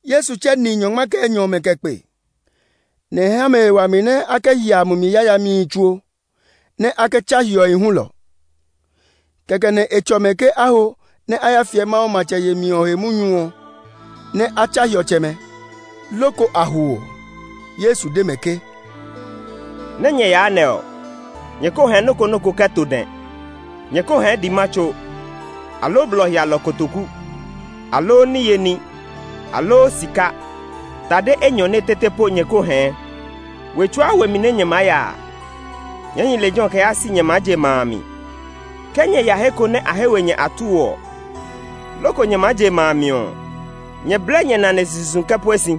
Yesu tsɛ ni nyɔngma kɛ enyɔ ɔmɛ kɛ kpe, nɛ e ha mɛ he wami nɛ a kɛ hia mumi yayamihi tsuo, nɛ a kɛ tsa hiɔhi hulɔ. Kɛkɛ nɛ e tsɔ mɛ ke a ho nɛ a ya fiɛ Mawu matsɛ yemi ɔ he munyu ɔ, nɛ a tsa hiɔtsɛmɛ. Loko a ho ɔ, Yesu de mɛ ke, “Nɛ nyɛ yaa nɛ ɔ, nyɛ ko hɛɛ nɔ́ ko nɔ́ ko kɛ to dɛ. Nyɛ ko hɛɛ dɛma tso, aloo blɔ hialɔ kotoku, aloo niye ní, aloo sika; tade enyɔne tete po nyɛ ko hɛɛ. We tsuaa we mi nɛ nyɛ maa ya a, nyɛɛ hi lejɛ ɔ kɛ yaa si nyɛ maa je ma a mi. Ke nyɛ ya he ko nɛ a he we nyɛ atuu ɔ, loko nyɛ maa je ma a mi ɔ, nyɛ blɛ nyɛ nane sisi zu kɛ pue si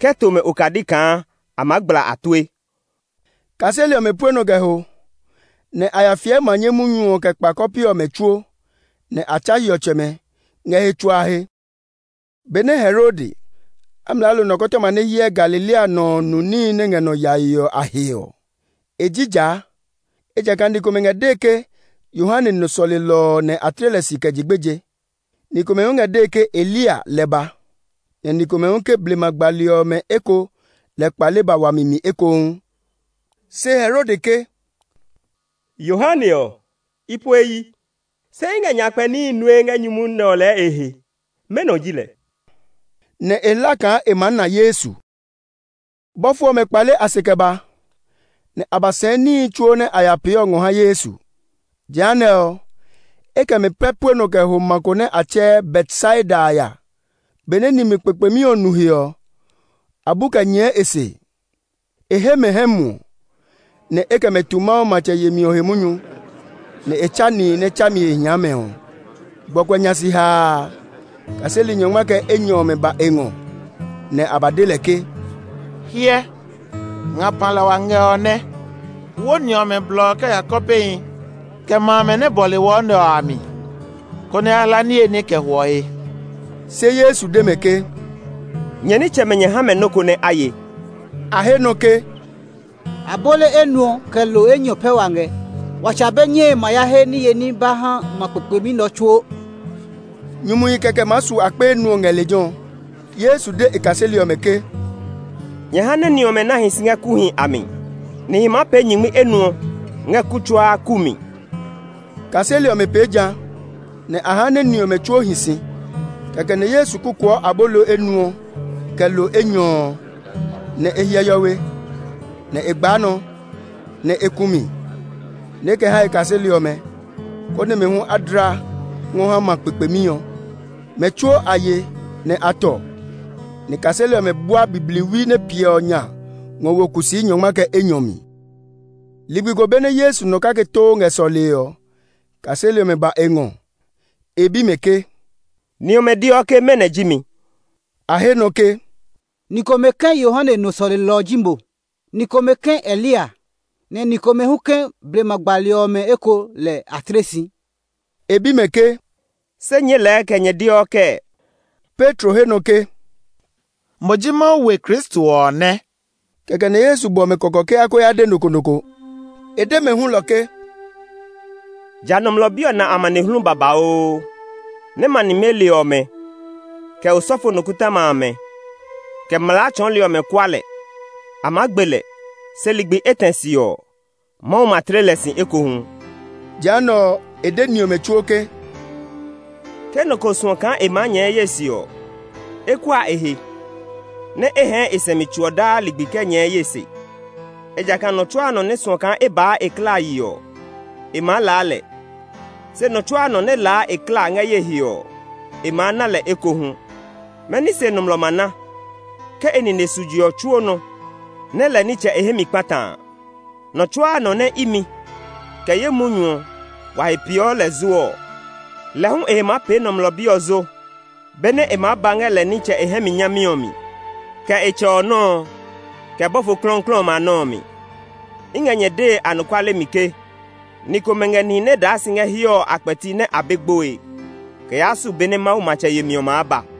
kɛ to mɛ okadi kaa a maa gbla a tue.” Kaseli ɔmɛ pue nɔ kɛ ho, nɛ a ya fiɛ manye munyu ɔ kɛ kpa kɔpe ɔmɛ tsuo, nɛ a tsa hiɔtsɛmɛ ngɛ he tsuaa he. Benɛ Herode, amlaalo nɔkɔtɔma nɛ hyɛɛ Galilea nɔ ɔ nu níhi nɛ ngɛ nɔ yae ɔ a he ɔ, e jija; ejakaa ni komɛ ngɛ dee ke Yohane nɔ sɔlelɔ ɔ nɛ a tle si kɛ je gbeje. Ni komɛ hu ngɛ dee ke Eliya lɛ ba; nɛ ni komɛ hu ke blema gbali ɔmɛ eko lɛ kpale ba wami mi ekohu. Se Herode ke, “Yohane ɔ, i po e yi. Se i ngɛ nyakpɛ níhi nue ngɛ nyumu nɛ ɔ lɛɛ e he. Mɛnɔ ji lɛ?” Nɛ e hla kaa e maa na Yesu. Bɔfo ɔmɛ kpale a se kɛ ba, nɛ a ba sɛɛ níhi tsuo nɛ a ya pee ɔ ngɔ ha Yesu. Jehanɛ ɔ, e kɛ mɛ pɛ pue nɔ kɛ ho ma ko nɛ a tsɛɛ Betsaida a ya. Benɛ nimli kpekpemi ɔ nu he ɔ, a bu kɛ nyɛɛ e se. E he mɛ hɛmuɔ, nɛ e kɛ mɛ tu Mawu matsɛ yemi ɔ he munyu; nɛ e tsa nihi nɛ tsami he hia mɛ. Gbɔkuɛ nya si haa a, kaseli nyɔngma kɛ enyɔ ɔmɛ ba e ngɔ, nɛ a ba de lɛ ke, “Hyɛ, ngapa lɛ wa ngɛ nɛ ɔ nɛ! Wo ni ɔmɛ blɔ kɛ ya kɔpehi, kɛ ma amɛ nɛ bɔle wɔ nɛ ɔ a mi, konɛ a ya hla niye ní kɛ hwɔ he.” Se Yesu de mɛ ke, “Nyɛ nitsɛmɛ nyɛ ha mɛ nɔ́ ko nɛ a ye.” A he nɔ ke, “Abolo enuɔ, kɛ lo enyɔ pɛ wa ngɛ. Wa tsa be nyɛe ma ya he niye ní ba ha ma kpekpemi nɛ ɔ tsuo!” Nyumuhi kɛkɛ maa su akpe enuɔ ngɛ lejɛ ɔ. Yesu de e kaseli ɔmɛ ke, “Nyɛ ha nɛ ni ɔmɛ nɛ a hi si ngɛ kuuhi a mi, nihi maa pee nyingmi enuɔ ngɛ kuu tsuaa kuu mi.” Kaseli ɔmɛ pee ja, nɛ a ha nɛ ni ɔmɛ tsuo hi si. Kɛkɛ nɛ Yesu kukuɔ abolo enuɔ, kɛ lo enyɔ ɔ, nɛ e hyɛ hiɔwe, nɛ e gbaa nɔ, nɛ e ku mi, nɛ e kɛ ha e kaseli ɔmɛ, konɛ mɛ hu a dla ngɔ ha ma kpekpemi ɔ. Mɛ tsuo a ye, nɛ a tɔ, nɛ kaseli ɔmɛ bua bibliwi nɛ piɛ ɔ nya ngɔ wo kusii nyɔngma kɛ enyɔ mi. Ligbi ko benɛ Yesu nɔ kake too ngɛ sɔlee ɔ, kaseli ɔmɛ ba e ngɔ. E bi mɛ ke, “Ni ɔmɛ deɔ ke mɛnɔ ji mi?” A he nɔ ke, “Ni komɛ ke Yohane nɔ sɔlelɔ ɔ ji mo; ni komɛ ke Eliya, nɛ ni komɛ hu ke blema gbali ɔmɛ eko lɛ a tle si.” E bi mɛ ke, “Se nyɛɛ lɛɛ kɛ nyɛ deɔ kɛɛ?” Petro he nɔ ke, “Mo ji Mawu we Kristo ɔ nɛ.” Kɛkɛ nɛ Yesu bɔ mɛ kɔkɔ ke a ko ya de nɔ ko nɔ ko. E de mɛ hulɔ ke, “Ja Nɔmlɔ Bi ɔ na amanehlu babauu, nɛ ma nimeli ɔmɛ, kɛ osɔfo nikɔtɔma amɛ, kɛ mlaa tsɔɔli ɔmɛ kua lɛ. A maa gbe lɛ, se ligbi etɛ se ɔ, Mawu ma tle lɛ si ekohu.” Jehanɛ ɔ, e de ni ɔmɛ tsuo ke, “Ke nɔ ko suɔ kaa e maa nyɛɛ ye se ɔ, e kua e he, nɛ e hɛɛ e sɛumi tso ɔ daa ligbi kɛ nyɛɛ ye se. Ejakaa nɔ tsuaa nɔ nɛ suɔ kaa e baa e klaa yi ɔ, e maa laa lɛ; se nɔ tsuaa nɔ nɛ laa e klaa ngɛ ye he ɔ, e maa na lɛ ekohu. Mɛni se nɔmlɔ ma na, ke e nine su je ɔ tsuo nɔ, nɛ lɛ nitsɛ e hɛ mi kpata a? Nɔ tsuaa nɔ nɛ imi, kɛ ye munyu ɔ, wa he peeɔ lɛ zo ɔ, lɛ hu e he maa pee Nɔmlɔ Bi ɔ zo benɛ e maa ba ngɛ lɛ nitsɛ e hɛ mi nyami ɔ mi, kɛ e Tsɛ nɔ́ ɔ, kɛ bɔfo klɔuklɔu ɔmɛ a nɔ́ ɔ mi. I ngɛ nyɛ dee anɔkuale mi ke, ni komɛ ngɛ nihi nɛ daa si ngɛ hiɛ ɔ a kpɛti nɛ a be gboe, kɛ yaa su be nɛ Mawu matsɛ yemi ɔ maa ba.”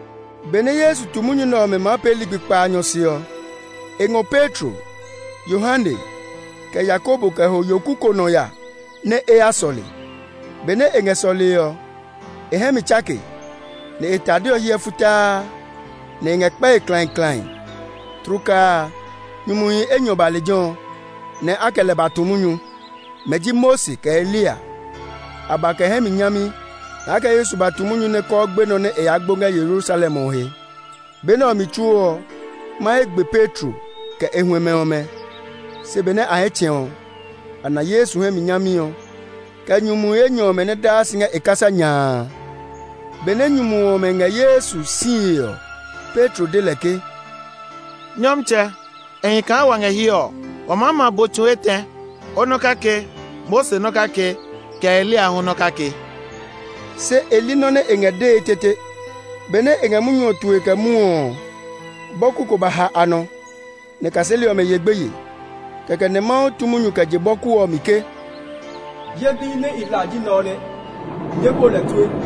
Benɛ Yesu tu munyu nɛ ɔmɛ maa pee ligbi kpaanyɔ se ɔ, e ngɔ Petro, Yohane, kɛ Yakobo kɛ ho yoku ko nɔ ya nɛ e ya sɔle. Benɛ e ngɛ sɔlee ɔ, e hɛ mi tsake, nɛ e tade ɔ hiɛ futaa, nɛ e ngɛ kpɛe klãiklãi. Tlukaa a, nyumuhi enyɔ ba lejɛ ɔ, nɛ a kɛ lɛ ba tu munyu. Mɛ ji Mose kɛ Eliya. A ba kɛ hɛ mi nyami, nɛ a kɛ Yesu ba tu munyu nɛ kɔɔ gbenɔ nɛ e yaa gbo ngɛ Yerusalem ɔ he. Be nɛ ɔ mi tsuo ɔ, mahe gbe Petro kɛ e huɛmɛ ɔmɛ. Se benɛ a hɛ tsɛ̃ ɔ, a na Yesu hɛ mi nyami ɔ, kɛ nyumuhi enyɔ ɔmɛ nɛ daa si ngɛ e kasa nya a. Benɛ nyumu ɔmɛ ngɛ Yesu sie ɔ, Petro de lɛ ke, “Nyɔmtsɛ, e hi kaa wa ngɛ hiɛ ɔ! Wa maa ma bo tsu etɛ, o nɔ́ kake, Mose nɔ́ kake, kɛ Eliya hu nɔ́ kake.” (Se e li nɔ́ nɛ e ngɛ dee tete). Benɛ e ngɛ munyu ɔ tue kɛ mwɔɔ ɔ, bɔku ko ba ha a nɔ, nɛ kaseli ɔmɛ ye gbeye. Kɛkɛ nɛ Mawu tu munyu kɛ je bɔku ɔ mi ke, “Ye Bi nɛ i hla ji nɛ ɔ nɛ; nyɛɛ bu lɛ tue!”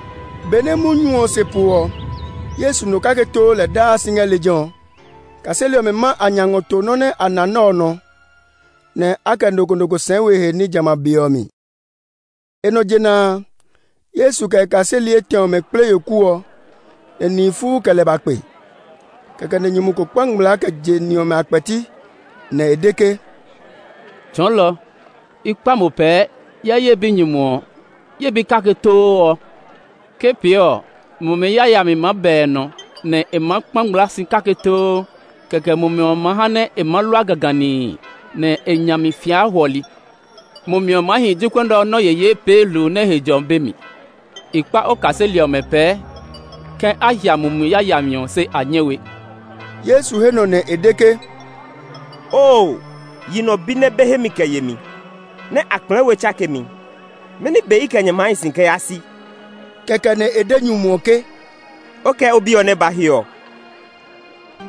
Benɛ munyu ɔ se po ɔ, Yesu nɔ kake too lɛ daa si ngɛ lejɛ ɔ. Kaseli ɔmɛ ma a nya ngɔ to nɔ́ nɛ a na nɛ ɔ nɔ, nɛ a kɛ nɔ ko nɔ ko sɛɛ we he ní jamɛ a be ɔ mi. E nɔ jena a, Yesu kɛ e kaseli etɛ ɔmɛ kple yoku ɔ, nɛ nihi fuu kɛ lɛ ba kpe. Kɛkɛ nɛ nyumu ko kpa ngmlaa kɛ je ni ɔmɛ a kpɛti, nɛ e de ke, “Tsɔɔlɔ! I kpa mo pɛɛ, hyɛ ye binyumu ɔ, ye bi kake too ɔ! Ke pee ɔ, mumi yayami maa ba e nɔ, nɛ e ma kpa ngmlaa si kake too. Kɛkɛ mumi ɔ ma ha nɛ e ma lua gaganii, nɛ e nya maa fia hwɔli. Mumi ɔ maa hi jokuɛ nɛ ɔ nɔ́ yeyee pee hluu nɛ he jɔmi be mi. I kpa o kaseli ɔmɛ pɛɛ ke a hia mumi yayami ɔ, se a nyɛ we.” Yesu he nɔ nɛ e de ke, “Oo yi nɔ bi nɛ be hemi kɛ yemi nɛ a kplɛɛ we tsakemi, mɛni be i kɛ nyɛ maa hi si kɛ yaa si?” Kɛkɛ nɛ e de nyumu ɔ ke, “O kɛ o bi ɔ nɛ ba hiɛ ɔ!”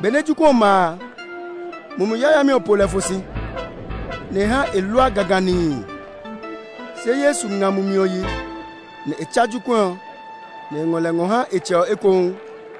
Benɛ jokuɛ ɔ ma a, mumi yayami ɔ po lɛ fɔ si, nɛ e ha e lua gaganii. Se Yesu nga mumi ɔ yi, nɛ e tsa jokuɛ ɔ, nɛ e ngɔ lɛ ngɔ ha e tsɛ ɔ ekohu.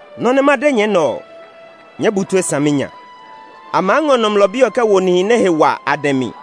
“Nɔ́ nɛ ma de nyɛ nɛ ɔ, nyɛɛ bu tue saminya! A maa ngɔ Nɔmlɔ Bi ɔ kɛ wo nihi nɛ he wa a dɛ mi.”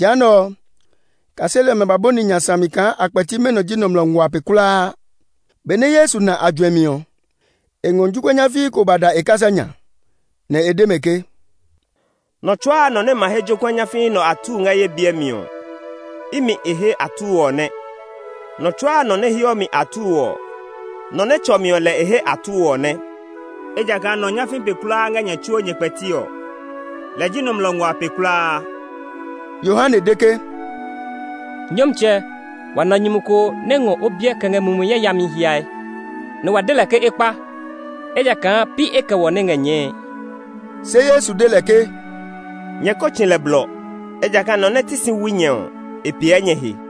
Jehanɛ ɔ, kaseli ɔmɛ ba bɔni nya sami kaa a kpɛti mɛnɔ ji nɔmlɔ nguaa pe kulaa. Benɛ Yesu na a juɛmi ɔ, e ngɔ jokuɛ nyafii ko ba da e kasa nya, nɛ e de mɛ ke, “Nɔ tsuaa nɔ nɛ ma he jokuɛ nyafii nɛ ɔ atuu ngɛ ye biɛ mi ɔ, imi e he atuu ɔ nɛ; nɔ tsuaa nɔ nɛ heɔ mi atuu ɔ, nɔ nɛ tsɔ mi ɔ lɛ e he atuu ɔ nɛ. Ejakaa nɔ nyafii pe kulaa ngɛ nyɛ tsuo nyɛ kpɛti ɔ, lɛ ji nɔmlɔ nguaa pe kulaa.” Yohane de ke, “Nyɔmtsɛ, wa na nyumu ko nɛ ngɔ o biɛ kɛ ngɛ mumi yayami hiae, nɛ wa de lɛ ke e kpa, ejakaa pi e kɛ wɔ nɛ ngɛ nyɛɛe.” Se Yesu de lɛ ke, “Nyɛ ko tsi lɛ blɔ; ejakaa nɔ nɛ ti si wui nyɛ ɔ, e piɛ nyɛ he.”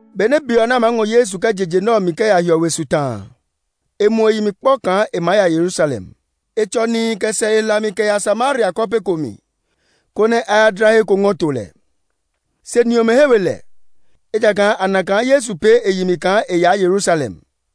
Benɛ be ɔ nɛ a maa ngɔ Yesu kɛ je je nɛ ɔ mi kɛ ya hiɔwe ɔ su ta a, e muɔ e yi mi kpɔ kaa e maa ya Yerusalem. E tsɔ nihi kɛ sɛ e hlami kɛ ya Samaria kɔpe ko mi, konɛ a ya dla he ko ngɔ to lɛ. Se ni ɔmɛ he we lɛ, ejakaa a na kaa Yesu pee e yi mi kaa e yaa Yerusalem.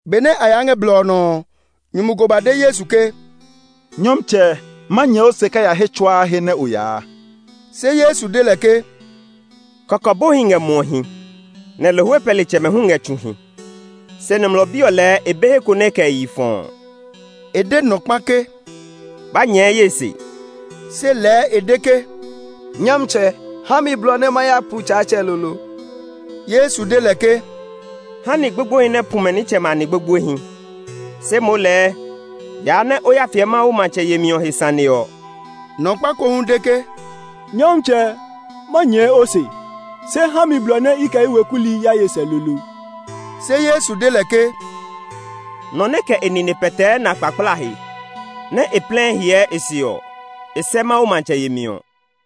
Benɛ a yaa ngɛ blɔ ɔ nɔ ɔ, nyumu ko ba de Yesu ke, “Nyɔmtsɛ, ma nyɛɛ o se kɛ ya he tsuaa he nɛ o yaa.” Se Yesu de lɛ ke, “Kɔkɔbohi ngɛ muɔhi, nɛ lohwe pɛlitsɛmɛ hu ngɛ tsuhi; se Nɔmlɔ Bi ɔ lɛɛ e be he ko nɛ e kɛ e yi fɔɔ.” E de nɔ kpa ke, “Ba nyɛɛ ye se!” Se lɛɛ e de ke, “Nyɔmtsɛ, ha mi blɔ nɛ ma ya pu tsaatsɛ lolo.” Yesu de lɛ ke, “Ha nɛ ni gbogboehi nɛ a pu mɛ nitsɛmɛ a ni gbogboehi. Se moo lɛɛ yaa nɛ o ya fiɛ Mawu matsɛ yemi ɔ he sane ɔ.” Nyumu kpa ko hu de ke, “Nyɔmtsɛ, ma nyɛɛ o se. Se ha mi blɔ nɛ i kɛ ye we ku hi ya ye sɛ lolo.” Se Yesu de lɛ ke, “Nɔ nɛ kɛ e nine pɛtɛɛ na kpakplaa he, nɛ e plɛɛ hyɛɛ e se ɔ, e sɛ Mawu matsɛ yemi ɔ.”